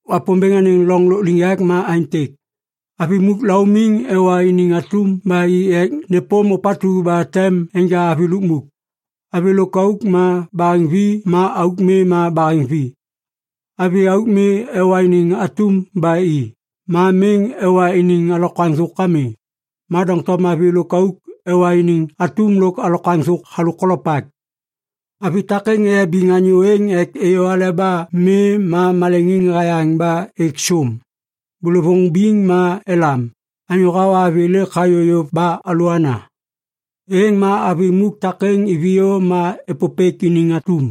“Wapômbêŋ anêŋ lôkliŋyak ma aêntêk. Avi muk laumiŋ ewa iniŋ atum ba i ek nêpôm ôpatu ba tem enja avi lukmuk. Avi lôkauk ma baheŋvi ma auk mi ma baheŋvi. Avi auk mi ewa iniŋ atum ba i, ma miŋ ewa iniŋ alokwaŋ thôk ami. Ma doŋtom avi lôkauk ewa iniŋ atum lôk alokwaŋ thôk halôk kolopak. Avi takêŋ eyabiŋ anyô êŋ ek êyô aleba mi ma maleŋiŋ hayaŋ ba êk sôm. “Bôlôvôŋ biŋ ma elam, ‘Anyô hawa avi lêk hayô yôv ba alôana!’ “Êŋ ma avi muk takêŋ iviyô ma êpôpêk iniŋ atum.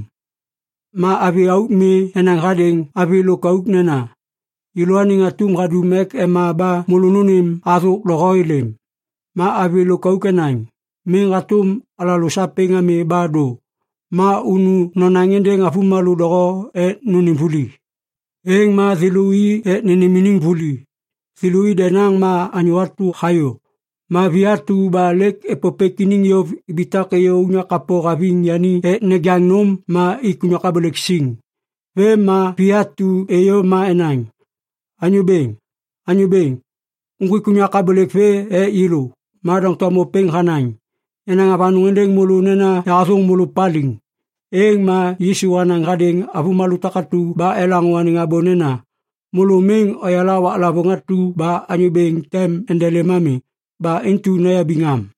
Ma avi auk mi enaŋ hadêŋ avi lôkauk nena, ‘Yêlôaniŋ atum hadum ek ema ba môlô nônêm athôk doho êlêm.’ “Ma avi lôkauk enaŋ, ‘Miŋ hatôm alalô sapêŋ ami ba dô, ma unu nonaŋ êndêŋ avômalô doho ek nônêm vuli.’ “Êŋ ma thêlô i ek nênêm iniŋ vuli. Thêlô i denaŋ ma anyô atu hayô. Ma vi atu ba lêk êpôpêk i yôv ibitak êyô unyak kapô haviŋ yani ek nejaŋ nôm ma ik unyak abôlêk siŋ. “Vêm ma vi atu êyô ma enaŋ, ‘Anyô bêŋ, anyô bêŋ! Uŋgwik unyak abôlêk vê ek yêlô.’ “Ma doŋtom ôpêŋ hanaŋ, ‘Yanaŋ avanôŋ êndêŋ môlô nena yahathôŋ môlô paliŋ.’” Êŋ ma Yisu hanaŋ hadêŋ avômalô takatu ba elaŋô anêŋ abô nena, “Môlô miŋ oyala waklavôŋ atu ba Anyô Bêŋ tem endelêm ami. Ba intu noyabiŋ am.”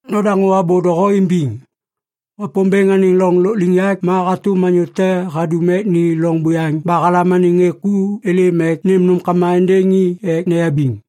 “Nodaŋô abô doho imbiŋ. Wapômbêŋ anêŋ loŋ lôkliŋyak ma hatôm anyô te hadum ek ni loŋ buyaŋ ba halam anêŋ ŋê ku êlêm ek nêm nômkama êndêŋ i ek neyabiŋ.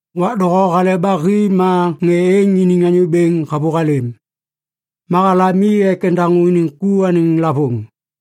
“Wak doho hale ba hi ma ŋê êŋ iniŋ anyô bêŋ havôhalêm. Ma halam i ek endaŋô iniŋ ku anêŋ lavôŋ.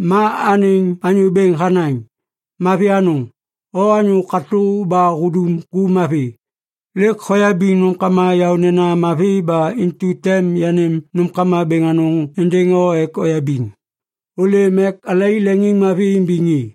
“Ma anêŋ anyô bêŋ hanaŋ, ‘Mavi anôŋ! O anyô katô ba hudum ku mavi. Lêk hoyabiŋ nômkama yaônena mavi ba intu tem yanêm nômkama bêŋ anôŋ êndêŋ o ek oyabiŋ. Ôlêm ek alai leŋiŋmavi imbiŋ i!’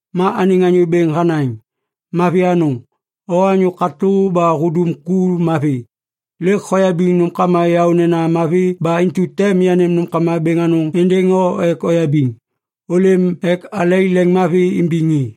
“Ma anêŋ anyô bêŋ hanaŋ ‘Mavi anôŋ! O anyô katô ba hudum ku mavi. Lêk hoyabiŋ nômkama yaônena mavi ba intu tem yanêm nômkama bêŋ anôŋ êndêŋ o ek oyabiŋ. Ôlêm ek alai leŋiŋmavi imbiŋ i!’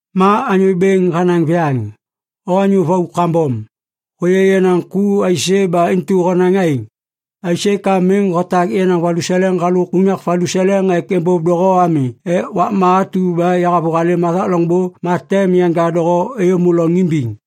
“Ma anyô bêŋ hanaŋ viyaŋ, ‘O anyô vau kambom! Hôyê yenaŋ ku aisê ba intu honaŋ aêŋ? Aisê ka miŋ hotak yenaŋ valuseleŋ halôk unyak valuseleŋ ek êmbôv doho ami ek wakma atu ba yahavôhalêm hathak loŋbô ma tem yanja doho êyômô loŋ imbiŋ.’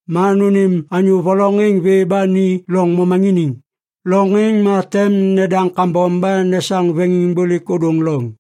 Ma nônêm ôpêŋ vê ba ni loŋ momaŋiniŋ. Loŋ êŋ ma tem nedaŋ kambom ba nesaŋ veŋiŋbôlêk ôdôŋ loŋ.’”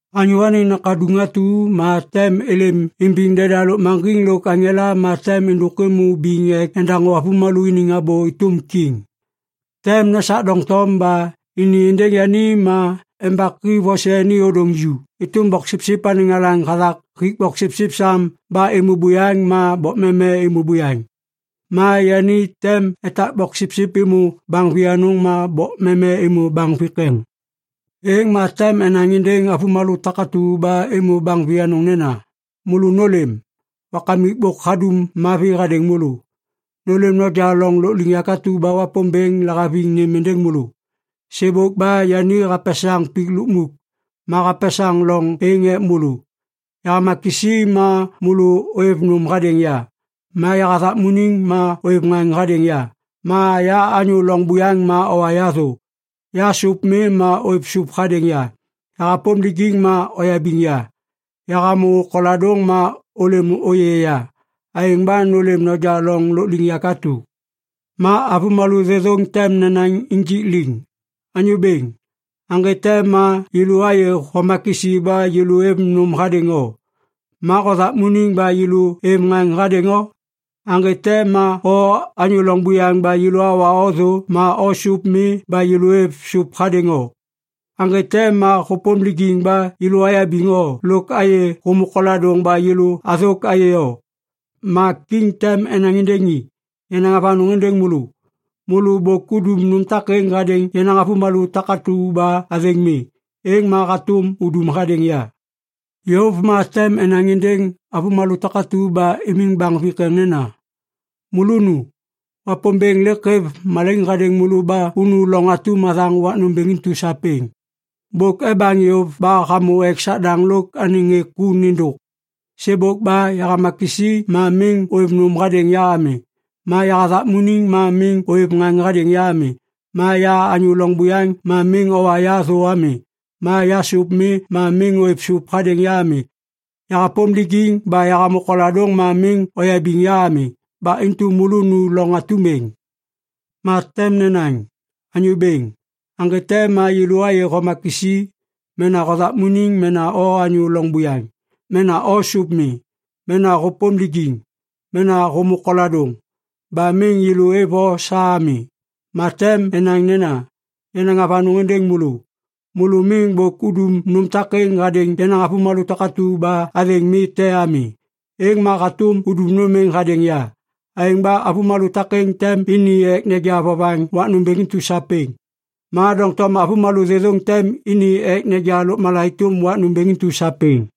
“Anyô Anêŋ Nakaduŋ atu ma tem êlêm imbiŋ deda lôkmaŋgiŋ lôk aŋela ma tem êndôk êmô biŋ ek endaŋô avômalô iniŋ abô êtôm kiŋ. Tem nesak doŋtom ba ini êndêŋ yani ma embaki vose ni ôdôŋ ju êtôm boksipsip anêŋ alaŋ hathak hik boksipsip sam ba êmô buyaŋ ma bokmeme êmô buyaŋ. Ma yani tem etak boksipsip êmô baŋ vianôŋ ma bokmeme êmô baŋ vikeŋ. “Êŋ ma tem enaŋ êndêŋ avômalô takatu ba êmô baŋ vianôŋ nena, ‘Môlô nôlêm! Wakamik bôk hadum mavi hadêŋ môlô. Nôlêm noja loŋ lôkliŋyak atu ba Wapômbêŋ lahaviŋ nêm êndêŋ môlô. Sêbôk ba yani hapesaŋ pik lukmuk, ma hapesaŋ loŋ êŋ êk môlô. Yahama kisi ma môlô ôêv nôm hadêŋ ya, ma yahathakmuniŋ ma ôêv ŋaŋ hadêŋ ya, ma ya anyô loŋ buyaŋ ma owa ya thô. Ya sôp mi ma ôêv sôp hadêŋ ya, yahapôm lijiŋ ma oyabiŋ ya, yahamô koladôŋ ma ôlêm ôyê ya. Aêŋ ba nôlêm noja loŋ lôkliŋyak atu!’ “Ma avômalô thêthôŋ tem nenaŋ injik liŋ, ‘Anyô Bêŋ, aŋgê te ma yêlô ayê homa kisi ba yêlô êv nôm hadêŋ o ma hothakmuniŋ ba yêlô êv ŋaŋ hadêŋ o? Aŋgê te ma o anyô loŋ buyaŋ ba yêlô awa o thô ma o sôp mi ba yêlô êv sôp hadêŋ o? Aŋgê te ma hôpôm lijiŋ ba yêlô ayabiŋ o lôk ayê hômô koladôŋ ba yêlô athôk ayê o?’ “Ma Kiŋ tem enaŋ êndêŋ i, ‘Yanaŋ avanôŋ êndêŋ môlô! Môlô bôk udum nôm takêŋ hadêŋ yenaŋ avômalô takatu ba athêŋ mi, êŋ ma hatôm udum hadêŋ ya.’ “Yôv ma tem enaŋ êndêŋ avômalô takatu ba imiŋ baŋ vikeŋ nena, ‘Môlô nu! Wapômbêŋ lêk hêv malaiŋ hadêŋ môlô ba unu loŋ atum hathaŋ wak nômbêŋ intu sapêŋ. Bôk ebaŋ yôv ba hamô ek Sadaŋ lôk anêŋ ŋê ku nêndôk. Sêbôk ba yahama kisi ma miŋ ôêv nôm hadêŋ ya ami, ma yahathakmuniŋ ma miŋ ôêv ŋaŋ hadêŋ ya ami. Ma ya anyô loŋ buyaŋ ma miŋ owa ya thô ami, ma ya sôp mi ma miŋ ôêv sôp hadêŋ ya ami. Yahapôm lijiŋ ba yahamô koladôŋ ma miŋ oyabiŋ ya ami. Ba intu môlô nu loŋ atum êŋ.’ “Ma tem nenaŋ, ‘Anyô Bêŋ, aŋgê te ma yêlô ayê homa kisi, mena hothakmuniŋ mena o anyô loŋ buyaŋ, mena o sôp mi, mena hôpôm lijiŋ, mena hômô koladôŋ, ba miŋ yêlô êv o sa ami?’ “Ma tem enaŋ nena, ‘Yanaŋ avanôŋ êndêŋ môlô! Môlô miŋ bôk udum nôm takêŋ hadêŋ yenaŋ avômalô takatu ba athêŋ mi te ami. Êŋ ma hatôm udum nôm êŋ hadêŋ ya.’ “Aêŋ ba avômalô takêŋ tem ini ek neja vovaŋ wak nômbêŋ intu sapêŋ. Ma doŋtom avômalô thêthôŋ tem ini ek neja lôkmala êtôm wak nômbêŋ intu sapêŋ.”